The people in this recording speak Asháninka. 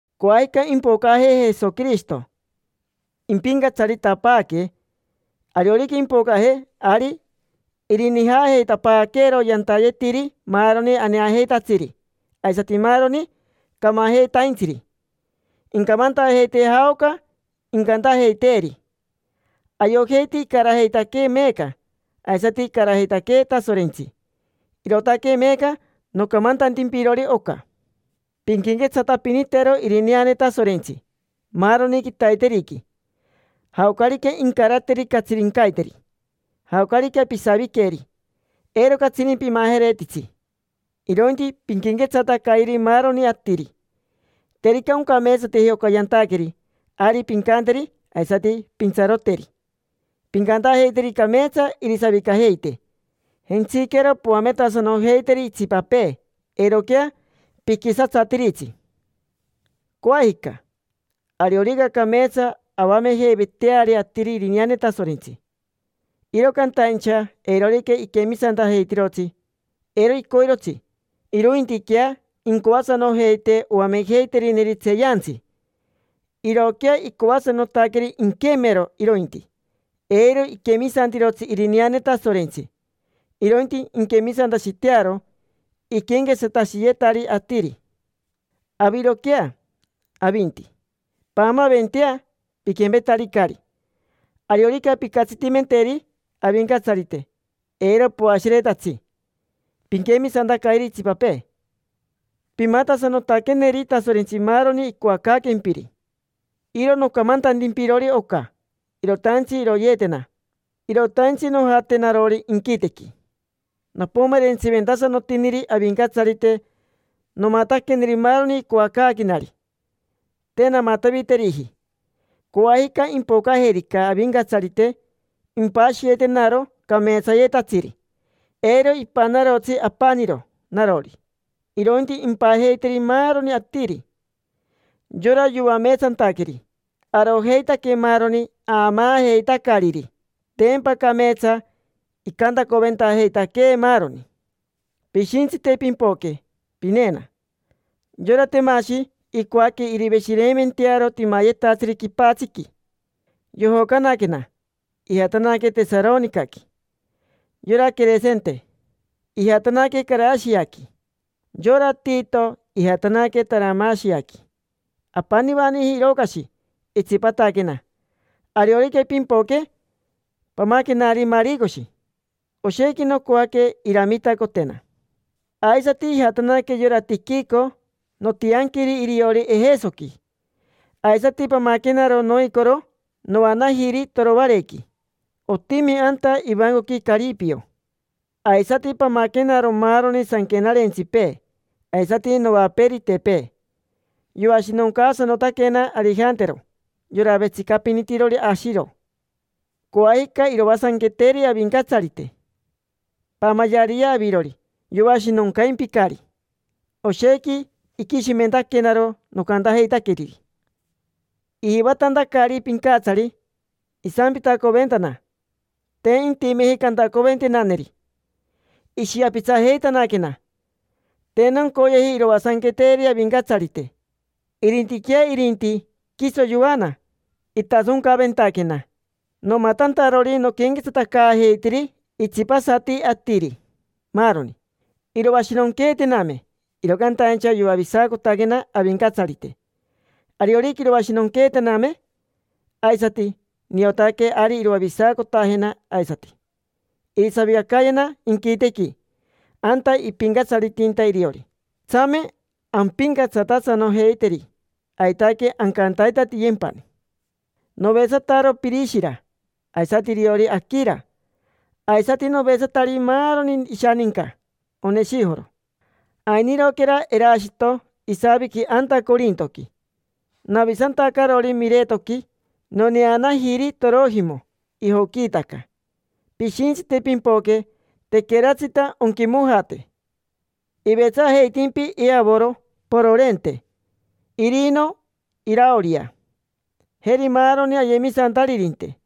Coajica impocaje Jesoquirishito impincatsaritapaaque. Ariorica impocaje, ari irinijaajeitapaaqueero yantayetiri maaroni aneajeitatsiri aisati maaroni camajeitaintsiri. Incamantajeitee jaoca incantajeiteeri. Ayojeiti icarajeitaquee meeca, aisati icarajeitaquee Tasorentsi, irootaque meeca nocamantantimpirori oca. Pinquenquetsatapinitero irineane Tasorentsi maaroni quitaiteriqui. Jaocarica incarateri catsirincaiteri, jaocarica pisaviqueri, eiro catsini pimajeretitsi, irointi pinquenquetsatacayeri maaroni atiri. Terica oncameetsateji oca yantaqueri, ari pincanteri, aisati pintsaroteri. Pincantajeiteri cameetsa irisavicajeite. Jentsiquero poametasanojeiteri itsipapee, eiroquea piquisatsatiritsi. Coajica, ariorica cameetsa avamejeiveteari atiri irineane Tasorentsi, iro cantaincha eirorica iquemisantajeitirotsi. Eiro icoirotsi, irointiquea incoasanojeite oamejeiterineri tseeyantsi. Irooquea icoasanotaqueri inquemero, irointi. Eiro iquemisantirotsi irineane Tasorentsi, irointi inquemisantashitearo iquenquetsatashiyetari atiri. Aviroquea, avinti, paamaventea: piquempetaricari. Ariorica pincatsitimenteri Avincatsarite, eiro poashiretatsi. Pinquemisantacayeri itsipapee. Pimatasanotaqueneri Tasorentsi maaroni icoacaaquempiri. Iro nocamantantimpirori oca, irotaintsi iroyeetena, irotaintsi nojate narori inquitequi. Nopomerentsiventasanotiniri Avincatsarite, nomataqueneri maaroni icoacaaquenari, te namataviteriji. Coajica, impocajerica Avincatsarite, impashiyetenaro cameetsayetatsiri. Eiro ipanarotsi apaniro narori, irointi impajeiteri maaroni atiri, yora yoameetsantaqueri: arojeitaque maaroni aamaajeitacariri. Tempa cameetsa icantacoventajeitaquee maaroni. Pishintsite pimpoque pineena. Yora Temashi, icoaque iriveshireimentearo timayetatsiri quipatsiqui. Yojocanaquena, ijatanaque Tesaronicaqui. Yora Queresente, ijatanaque Carashiaqui, yora Tito ijatanaque Taramashiaqui. Apanivaniji Irocashi, itsipataquena. Ariorica pimpoque, pamaquenari Maricoshi, oshequi nocoaque iramitacotena. Aisati ijatanaque yora Tiquico. Notianquiri iriori Ejesoqui. Aisati pamaquenaro noicoro noanajiri Toroarequi, otimi anta ivancoqui Caripio. Aisati pamaquenaro maaroni sanquenarentsipee, aisati novaperitepee. Yoashinoncaasanotaquena Arijantero, yora vetsicapinitirori ashiro. Coajica iroasanqueteri Avincatsarite. Paamayeariyea avirori, yoashinoncaimpicari. Oshequi iquishimentaquenaro nocantajeitaqueriri. Ijivatantacari pincatsari isampitacoventana, te intimeji cantacoventenaneri, ishiapitsajeitanaquena. Te noncoyeji iroasanqueteri Avincatsarite. Irintiquea irinti, quiso yoana. Itasoncaventaquena, nomatantarori noquenquetsatacaajeitiri itsipasati atiri, maaroni. Iroashinonqueetename, iro cantaincha yoavisacotaquena Avincatsarite. Ariorica iroashinonqueetaquename aisati, niotaque ari iroavisacotajena aisati; irisavicacayena inquitequi, anta ipincatsaritinta iriori. Tsame ampincatsatasanojeiteri, aitaque ancantaitatiyempani. Novetsataro Pirishira, aisati iriori Aquira. Aisati novetsatari maaroni ishaninca Oneshijoro. Ainiroquera Erashito, isaviqui anta Corintoqui. Navisantacarori Miretoqui, noneanajiri Torojimo: ijoquiitaca. Pishintsite pimpoque, tequeratsita onquimojate. Ivetsajeitimpi Eovoro, Pororente, Irino, Iraoria, jeri maaroni ayemisantaririnte.